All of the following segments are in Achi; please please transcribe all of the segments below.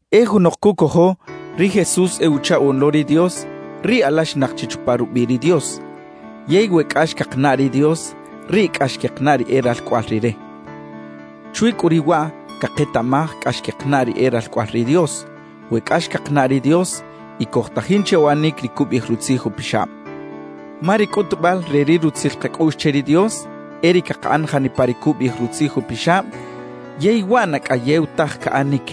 E junok cucojo ri Jesús e Uchaꞌoꞌn lo ri Dios, riꞌ alaxinak chi chupa rubiꞌ ri Dios. Yey we cꞌax cakanaꞌ ri Dios, riꞌ cꞌax quekanaꞌ ri e ralcꞌoꞌal Rire. Chwi cꞌu riꞌ waꞌ caketaꞌmaj cꞌax quekanaꞌ ri e ralcꞌoꞌal ri Dios, we cꞌax cakanaꞌ ri Dios y cojtajin che uꞌanic ri cubiꞌij Rutzij Upixab. Ma ri cꞌutubal re ri rutzil kacꞌuꞌx che ri Dios, e ri cakaꞌan janipa ri cubiꞌij Rutzij Upixab yey waꞌ na cꞌayew taj caꞌanic.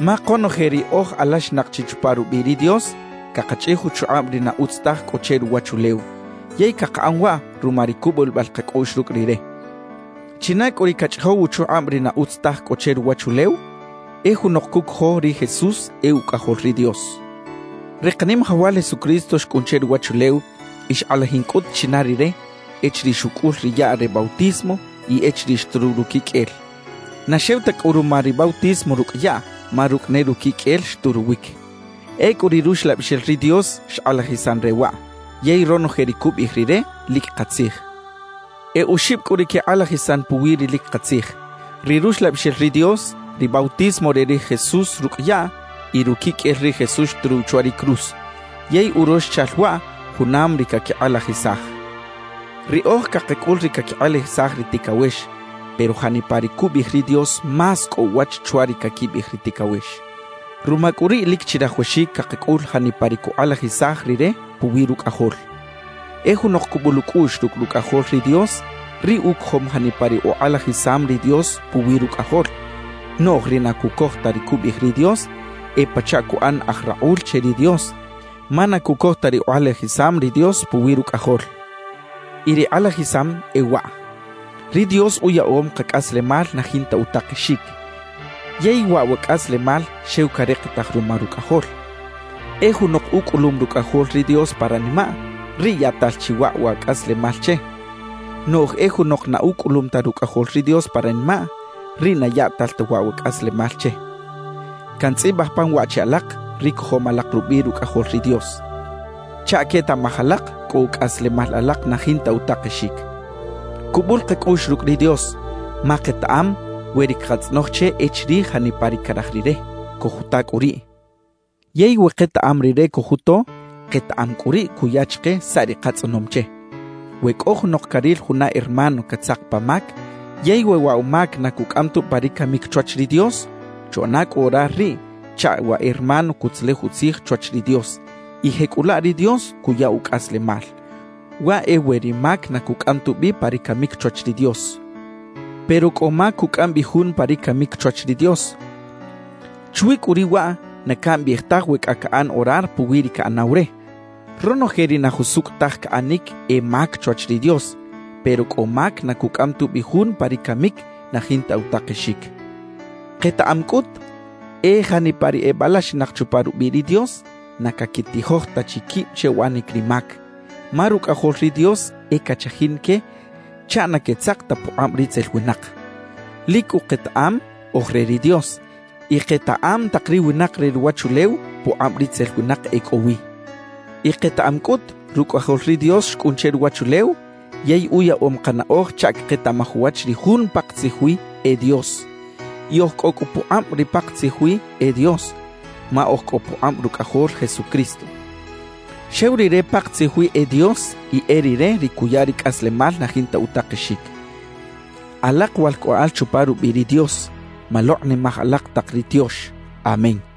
Ma konoje ri oj alaxinak chi chupa rubiꞌ ri Dios, cakachꞌij uchukꞌab ri na utz taj cꞌo che ruwachulew, yey cakaꞌan waꞌ ruma ri cubulibal kacꞌuꞌx rucꞌ Rire. ¿China cꞌu ri cachꞌijow uchukꞌab ri na utz taj cꞌo che ruwachulew? E junok cucojo ri Jesús e Ucꞌajol ri Dios. Ri Kanimajawal Jesucristo xcꞌun che ruwachulew y xkꞌalajin cꞌut china Rire echiriꞌ xucꞌul ri yaꞌ re bautismo y echiriꞌ xturuw ruquiqꞌuel; na xew ta cꞌu ruma ri bautismo rucꞌ yaꞌ ma rucꞌ ne ruquiqꞌuel xturuwic. Ecꞌu ri Ruxlabixel ri Dios xkꞌalajisan re waꞌ; yey ronoje ri cubiꞌij Rire, lic katzij. E oxib cꞌu ri quekꞌalajisan puwi ri lic katzij: ri Ruxlabixel ri Dios, ri bautismo re ri Jesús rucꞌ yaꞌ y ruquiqꞌuel ri Jesús xturuw chwa ri cruz; yey uroxchal waꞌ junam ri caquikꞌalajisaj. Riꞌoj cakacꞌul ri caquikꞌalajisaj ri ticawex, pero janipa ri cubiꞌij ri Dios más cꞌo uwach chwa ri caquibiꞌij ri ticawex; ruma cꞌu riꞌ lic chirajawaxic cakacꞌul janipa ri cukꞌalajisaj Rire puwi Rucꞌajol. E junok cubul ucꞌuꞌx rucꞌ Rucꞌajol ri Dios, riꞌ ucojom janipa ri ukꞌalajisam ri Dios puwi Rucꞌajol. Noꞌj ri na cucoj ta ri cubiꞌij ri Dios, e pachaꞌ cuꞌan aj rakꞌul che ri Dios, ma na cucoj ta ri ukꞌalajisam ri Dios puwi Rucꞌajol. Y ri kꞌalajisam e waꞌ: Ri Dios uyaꞌom kacꞌaslemal na jinta utakexic, yey waꞌ wa cꞌaslemal xew carikitaj ruma Rucꞌajol. E junok ucꞌulum Rucꞌajol ri Dios pa ranimaꞌ, riꞌ yaꞌtal chi waꞌ wa cꞌaslemal che; noꞌj e junok na ucꞌulum ta Rucꞌajol ri Dios pa ranimaꞌ, riꞌ na yaꞌtal ta waꞌ wa cꞌaslemal che. Cantzꞌibaj pan waꞌ che alak ri cojom alak rubiꞌ Rucꞌajol ri Dios, chaꞌ quetaꞌmaj alak cꞌo cꞌaslemal alak na jinta utakexic. Cubul kacꞌuꞌx rucꞌ ri Dios ma ketaꞌam we ri cakatzꞌonoj che e chirij janipa ri caraj Rire, cojuta cꞌu riꞌ. Yey we ketaꞌam Rire cojuto, ketaꞌam cꞌu riꞌ cuya chike saꞌ ri katzꞌonom che. We cꞌo junok caril juna hermano catzak pa mac, yey we waꞌ wa mac na cucꞌam tubi pa ri camic chwach ri Dios, chuꞌana cꞌu orar riꞌ chaꞌ wa hermano cutzelej utzij chwach ri Dios y jecꞌulaꞌ ri Dios cuya ucꞌaslemal. Waꞌ e we ri mac na cucꞌam tubi pa ri camic chwach ri Dios. Pero cꞌo mac cucꞌam bi jun pa ri camic chwach ri Dios; chwi cꞌu riꞌ waꞌ na cambiꞌij taj we cꞌa caꞌan orar puwi ri caꞌanaw re. Ronoje ri na jusucꞌ taj caꞌanic e mac chwach ri Dios, pero cꞌo mac na cucꞌam tubi jun pa ri camic na jinta utakexic. Ketaꞌam cꞌut, e janipa ri ebalaxinak chupa rubiꞌ ri Dios, na caquitijoj ta chi quib che uꞌanic ri mac; ma Rucꞌajol ri Dios e cachajin que chaꞌ na quetzak ta pukꞌab ritzel winak. Lic cꞌu ketaꞌam oj re ri Dios, y ketaꞌam tak ri winak re ruwachulew pukꞌab ritzel winak e cꞌo wi. Y ketaꞌam cꞌut, Rucꞌajol ri Dios xcꞌun che ruwachulew, yey uyaꞌom kanaꞌoj chaꞌ caketaꞌmaj uwach ri Jun pakatzij wi e Dios. Y oj cꞌo cꞌu pukꞌab ri pakatzij wi e Dios, ma oj cꞌo pukꞌab Rucꞌajol Jesucristo. Xew Rire pakatzij wi e Dios y e Rire ri cuya ri cꞌaslemal na jinta utakexic. Alak walcꞌoꞌal chupa rubiꞌ ri Dios, malokꞌnimaj alak tak ri tiox. Amén.